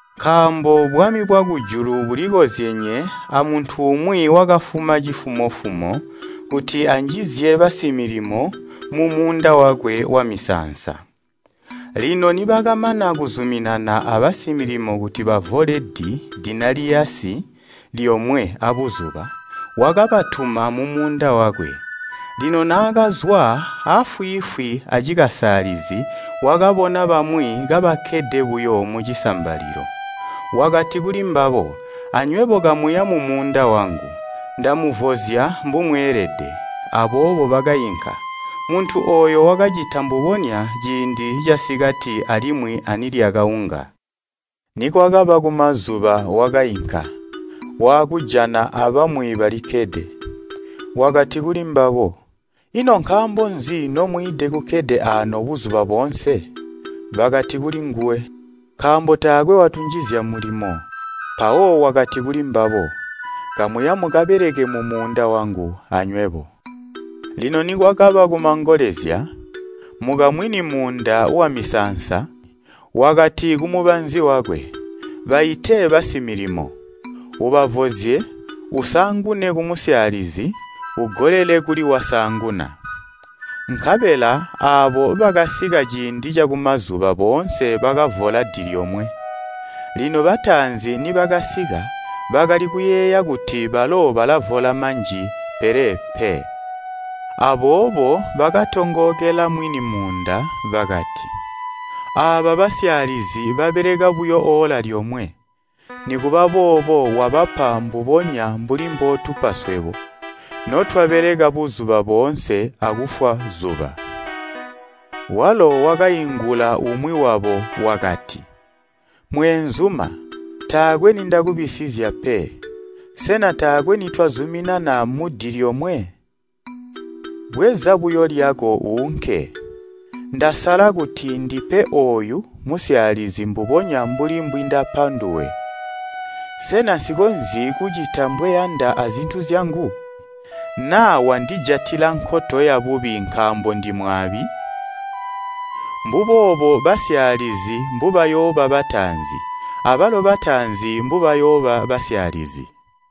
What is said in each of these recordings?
“Nkaambo bwami bwakujulu buli kozyenye amuntu umwi wakafuma cifumo-fumo kuti anjizye basimilimo mumuunda wakwe wamisaansa. Lino nibakamana kuzuminana abasimilimo kuti bavole di lyomwe abuzuba, wakabatuma mumuunda wakwe. Lino naakazwa, aafwiifwi acikasaalizi wakabona bamwi kabakkede buyo mucisambalilo. Wakati kulimbabo, ‘Anywebo kamuya mumuunda wangu, ndamuvozya mbumweelede.’ Aboobo bakainka. Muntu ooyo wakacita mbubonya ciindi casikati alimwi anilyakaunga. Nikwakaba kumazuba wakainka, waakujana abamwi balikkede, wakati kuli mbabo, ‘Ino nkaambo nzi nomwiide kukkede aano buzuba boonse?’ Bakati kulinguwe, ‘Nkaambo taakwe watunjizya mulimo.’ Mpawo wakati kulimbabo, ‘Kamuya mukabeleke mumuunda wangu anywebo.’ “Lino nikwakaba kumangolezya, mukamwini muunda wamisaansa wakati kumubanzi wakwe, ‘Baite basimilimo, ubavozye usaangune kumusyaalizi ugolele kuli wasaanguna.’ Nkabela aabo bakasika ciindi cakumazuba boonse bakavola di lyomwe. Lino bataanzi nibakasika, bakali kuyeeya kuti balo balavola manji pele pe, aboobo bakatongookela mwini muunda bakati, ‘Aaba basyaalizi babeleka buyo oola lyomwe, nikuba boobo wabapa mbubonya mbuli mbootupa swebo notwabeleka buzuba boonse akufwa zuba.’ Walo wakaingula umwi wabo wakati, ‘Mweenzuma, taakwe nindakubisizya pe. Sena taakwe nitwazuminana mudi lyomwe? Bweza buyo lyako uunke, ndasala kuti ndipe ooyu musyaalizi mbubonya mbuli mbwindapa nduwe. Sena nsikonzyi kucita mbweyanda azintu zyangu? Naa wandijatila nkoto yabubi nkaambo ndimwaabi?’ Mbuboobo basyaalizi mbubayooba bataanzi abalo bataanzi mbubayooba basyaalizi.”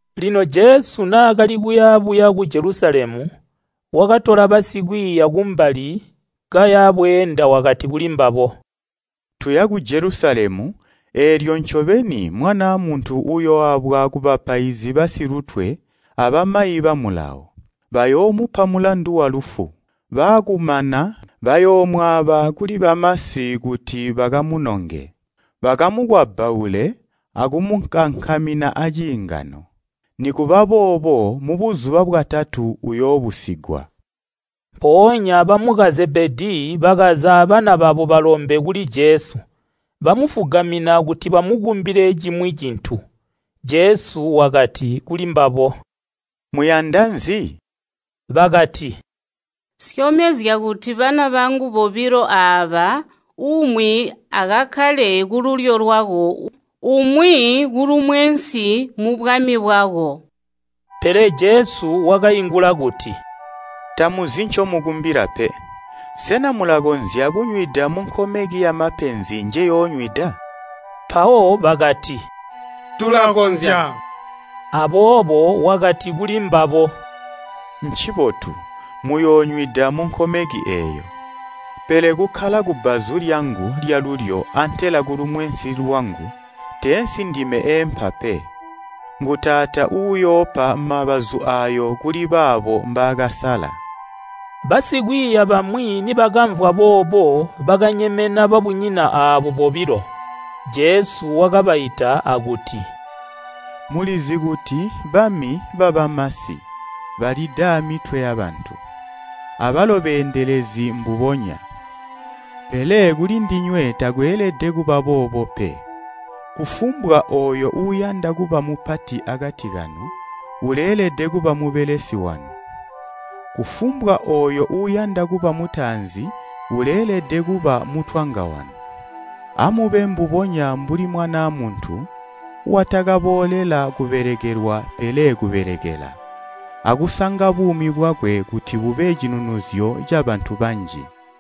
Lino Jesu naakali kuya buya ku Jelusalemu, wakatola basikwiiya kumbali kaya bweenda wakati kulimbabo, “Tuya ku Jelusalemu eelyo ncobeni Mwanaa Muntu uyooabwa kubapaizi basilutwe abamayi ba Mulawo. Bayoomupa mulandu walufu, baakumana bayoomwaaba kuli bamasi kuti bakamunonge, bakamukwabbaule akumukankamina aciingano. Nikuba boobo mubuzuba bwatatu uyoobusigwa.” Mpoonya bamuka Zebedii bakaza abana babo balombe kuli Jesu. Bamufugamina kuti bamukumbile cimwi cintu. Jesu wakati kulimbabo, “Muyanda nzi?” Bakati, “Syomezya kuti bana bangu bobilo aaba, umwi akakkale kululyo lwako, umwi kulumwensi mubwami bwako.” Pele Jesu wakaingula kuti “Tamuzi ncomukumbila pe. Sena mulakonzya kunywida munkomeki yamapenzi njeyoonywida?” Mpawo bakati, “Tulakonzya.” Aboobo wakati kuli mbabo, “Ncibotu, muyoonywida munkomeki eeyo, pele kukkala kubbazu lyangu lyalulyo antela kulumwensi lwangu, teensi ndime eempa pe. Ngu Taata uyoopa mabazu aayo kuli baabo mbaakasala.” Basikwiiya bamwi nibakamvwa boobo bakanyemena babunyina aabo bobilo. Jesu wakabaita akuti, “Mulizi kuti bami babamasi balida amitwe yabantu, abalo beendelezi mbubonya. Pele kulindinywe takweelede kuba boobo pe. Kufumbwa ooyo uuyanda kuba mupati akati kanu uleelede kuba mubelesi wanu. Kufumbwa ooyo uuyanda kuba mutaanzi uleelede kuba mutwanga wanu. Amube mbubonya mbuli Mwanaa Muntu watakaboolela kubelekelwa pele kubelekela, akusanga buumi bwakwe kuti bube cinunuzyo cabantu boonse.”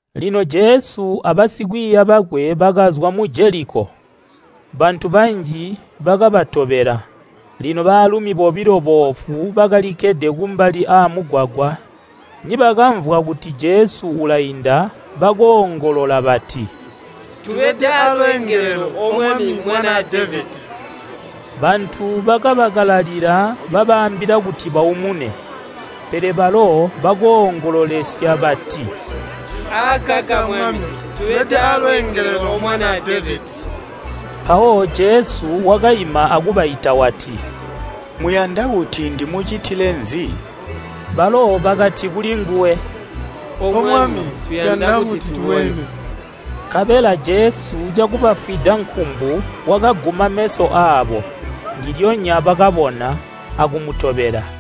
Lino Jesu abasikwiiya bakwe bakazwa mu Jeliko, bantu banji bakabatobela. Lino baalumi bobilo boofu bakalikkede kumbali aamugwagwa nibakamvwa kuti Jesu ulainda bakoongolola bati, “Tubede aalweengelelo, O Mwami Mwanaa Devedi!” Bantu bakabakalalila babaambila kuti baumune. Pele balo bakoongololesya bati, “Akaka Mwami, tubede aalweengelelo, O Mwanaa Devedi.” Mpawo Jesu wakaima akubaita wati, “Muyanda kuti ndimucitile nzi?” Balo bakati kulinguwe, “O Mwami tuyanda kuti tubone.” Nkabela Jesu cakubafwida nkumbu wakaguma meso aabo, ndilyonya bakabona, akumutobela.